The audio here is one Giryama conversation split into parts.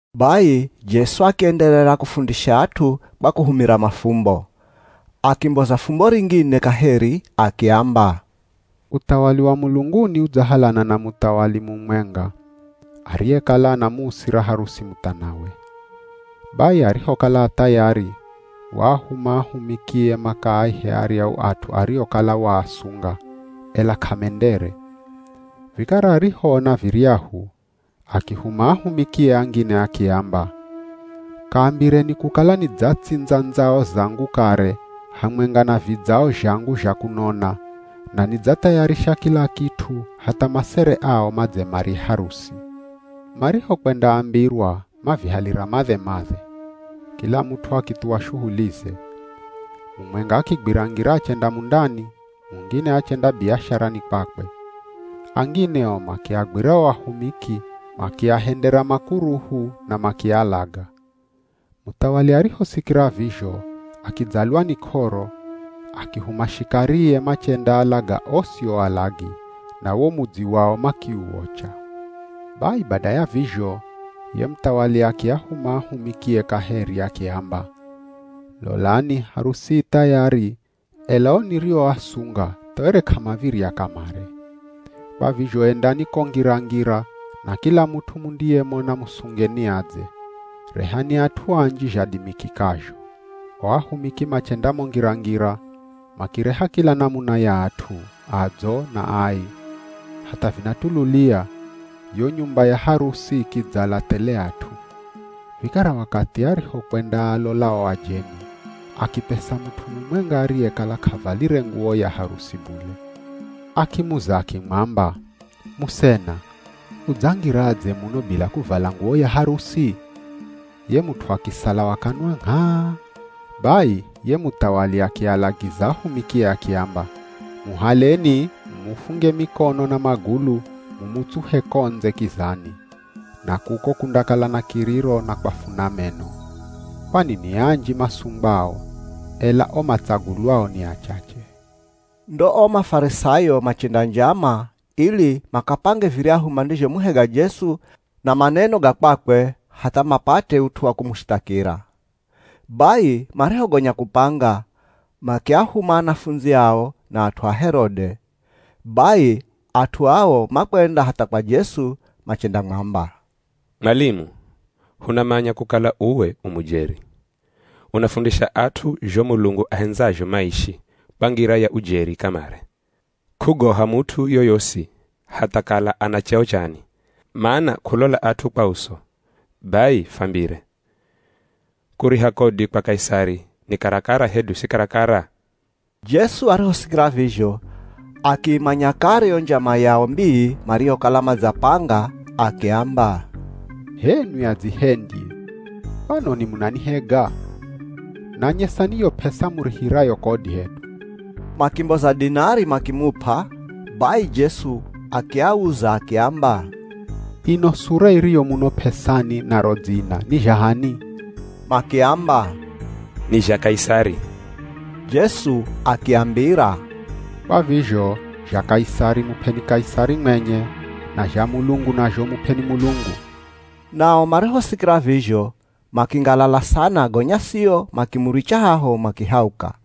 Bai Jesu akienderera kufundisha at'u kwa kuhumira mafumbo. Akimboza fumbo ringine kaheri akiamba, “Uthawali wa mulunguni, udzahalana na muthawali mumwenga ariyekala anamuusira harusi muthanawe. Bai arihokala a thayari, waahuma ahumikie makaaihe aryahu at'u ariokala waasunga, ela k'amendere. Vikara arihoona viryahu, akihuma ahumikie angine akiamba, ‘Kaambireni kukala nidzatsindza ndzao zangu kare, hamwenga na vidzao zhangu zha kunona, na nidzathayarisha kila kit'u hatha masere ao madze marye harusi.’ Marihokwendaambirwa mavihalira madhe-madhe. Kila mut'u akithuwa shuhulize. Mumwenga akigwira ngira achenda mundani, mungine achenda biasharani kwakwe. Angine o makiagwira o ahumiki makiahendera makuruhu na makialaga. “Muthawali arihosikira vizho akidzalwa ni k'oro, akihuma shikarie machendaalaga osi o alagi, na wo mudzi wao makiuocha. “Bai bada ya vizho, ye muthawali akiahuma ahumikie kaheri akiamba, ‘Lolani harusi i thayari ela o nirioasunga tha were k'amav̱irya kamare. Kwa vizho endani ko ngira-ngira na kila mut'u mundiyemona musungeni adze. Rehani at'u anji zhadimikikazho.’ O ahumiki machenda mo ngira-ngira, makireha kila namuna ya at'u, adzo na ai. Hatha vinatululia, yo nyumba ya harusi ikidzala thele at'u. “Vikara wakathi arihokwendaalola o ajeni, akipesa mut'u mumwenga ariyekala k'avalire nguwo ya harusi bule. Akimuza akimwamba, ‘Musena, udzangiradze muno bila kuvala nguwo ya harusi?’ Ye mut'u akisala wa kanwa ngh'aa. Bai ye muthawali akialagiza ahumikie akiamba, ‘Muhaleni mumufunge mikono na magulu mumutsuhe ko ndze kizani. Na kuko kundakala na kiriro na kwafuna meno.’ “Kwani ni anji masungwao, ela o matsagulwao ni achache.” Ndo o Mafarisayo machenda njama, ili makapange viryahu mandizhomuhega Jesu na maneno ga kwakwe hatha mapate ut'u wa kumushithakira. Bai marihogonya kupanga, makiahuma anafundzi ao, na at'u a Herode. Bai, at'u ao makwenda hatha kwa Jesu machendamwamba, “Mwalimu, hunamanya kukala uwe u mujeri. Unafundisha at'u zho Mulungu ahendzazho maishi, kwa ngira ya ujeri kamare. K'ugoha mut'u yoyosi hatha kala ana cheo chani. Mana k'ulola at'u kwa uso. Bai fwambire. Kuriha kodi kwa Kaisari ni karakara hedu si karakara?” Jesu arihosikira vizho, akiimanya kare yo njama yao mbii mariyokala madzapanga, akiamba, “H'enwi adzihendyi! Kwanoni munanihega? Nanyesani yo p'esa murihirayo kodi hedu.” Makimboza dinari makimup'a. Bai Jesu akiauza akiamba, “Ino sura iriyo muno p'esani na ro dzina ni zha h'ani?” Makiamba, “Ni zha Kaisari.” Jesu akiambira, “Kwa vizho, zha Kaisari mup'eni Kaisari mwenye, na zha Mulungu nazho mup'eni Mulungu.” Nao marihosikira vizho, makingalala sana gonya sio, makimuricha haho makihauka.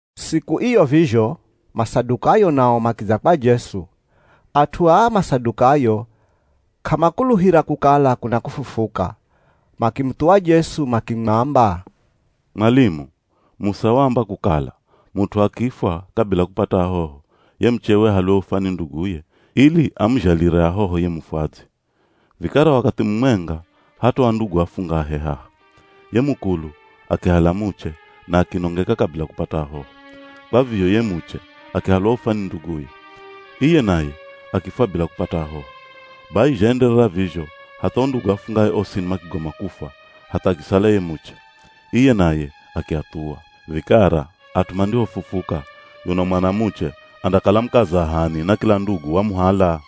Siku iyo vizho, Masadukayo nao makidza kwa Jesu. At'u aa Masadukayo, k'amakuluhira kukala kuna kufufuka. Makimuthuwa Jesu makimwamba, “Mwalimu, Musa waamba kukala, mut'u akifwa kabila kupata ahoho, ye muchewe ahalwe ufwa ni nduguye ili amuzhalire ahoho ye mufwadzi. Vikara wakathi mumwenga hatoa ndugu afungahe haha. Ye mukulu akihala muche na akinongeka kabila kupata ahoho. Kwa vizho ye muche akihalwa ufwa ni nduguye. Iye naye akifwa bila kupata ahoho. Bai zhaenderera vizho hatha o ndugu afungahe osini makigoma kufwa hatha akisala ye muche. Iye naye akiathuwa. Vikara at'u mandihofufuka, yuno mwanamuche andakala mukaza h'ani na kila ndugu wamuhala?”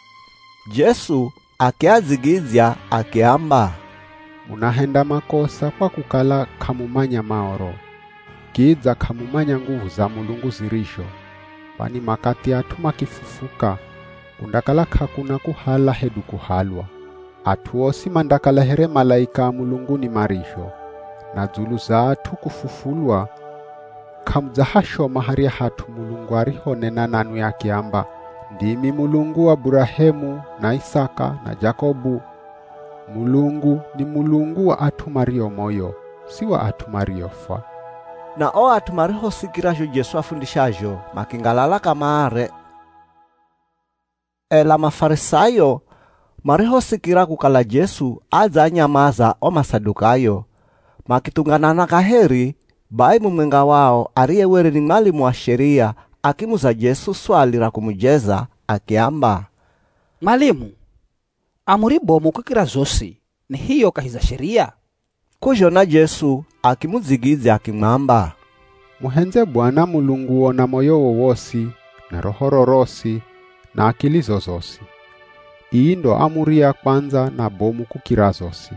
Jesu akiadzigidzya akiamba, “Munahenda makosa kwa kukala k'amumanya Maoro, kidza k'amumanya nguvu za Mulungu zirizho. Kwani makathi at'u makifufuka, kundakala k'akuna kuhala hedu kuhalwa. At'u osi mandakala here malaika a mulunguni marizho. Na dzulu za at'u kufufulwa, k'amudzahashoma harya hat'u Mulungu arihonena nanwi akiamba, ‘Ndimi Mulungu wa Burahemu, na Isaka, na Jakobu?’ Mulungu ni Mulungu wa at'u mario moyo, si wa at'u mariofwa!” Na o at'u marihosikira zho Jesu afundishazho, makingalala kamare. Ela Mafarisayo marihosikira kukala Jesu adzaanyamaza o Masadukayo, makithunganana kaheri. Bai mumwenga wao, ariye were ni mwalimu wa Sheria akimuza Jesu swali ra kumujeza. Akiamba, “Mwalimu, amuri bomu kukira zosi ni hiyo kahi za Sheria?” K'uzhona Jesu akimudzigidzya akimwamba, “ ‘Muhendze Bwana Mulunguo na moyowo wosi, na rohoro rosi, na akilizo zosi.’ Ii ndo amuri ya kwandza na bomu kukira zosi.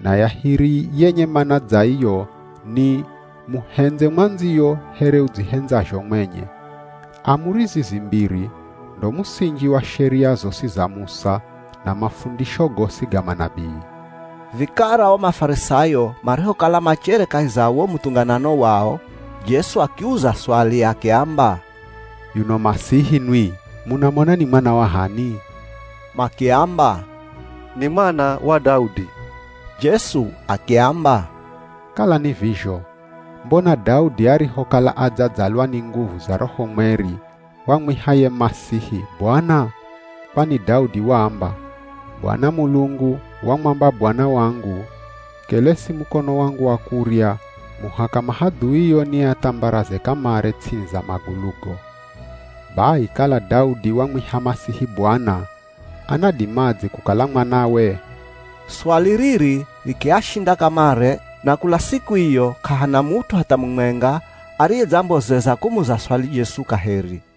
Na ya hiri yenye mana dza iyo, ni, ‘Muhendze mwandziyo here udzihendzazho mwenye.’ Amuri zizi mbiri, ndo musinji wa Sheria zosi za Musa, na mafundisho gosi ga manabii.” Vikara o Mafarisayo marihokala machere kahi za wo muthunganano wao, Jesu akiuza swali akiamba, “Yuno Masihi nwi, munamona ni mwana wa h'ani?” Makiamba, “Ni mwana wa Daudi.” Jesu akiamba, “Kala ni vizho, mbona Daudi arihokala adzadzalwa ni nguvu za Roho Mweri, wamwiha ye Masihi ‘Bwana’? Kwani Daudi waamba, ‘Bwana Mulungu wamwamba Bwana wangu, “Kelesi mukono wangu wa kurya, muhaka mahadhuio niathambaraze kamare ts'ini za magulugo.” ’ “Bai kala Daudi wamwiha Masihi, ‘Bwana,’ anadimadze kukala mwanawe?” Swali riri rikiashinda kamare. Na kula siku iyo, k'ahana mut'u hatha mumwenga ariyedzambozeza kumuza swali Jesu kaheri.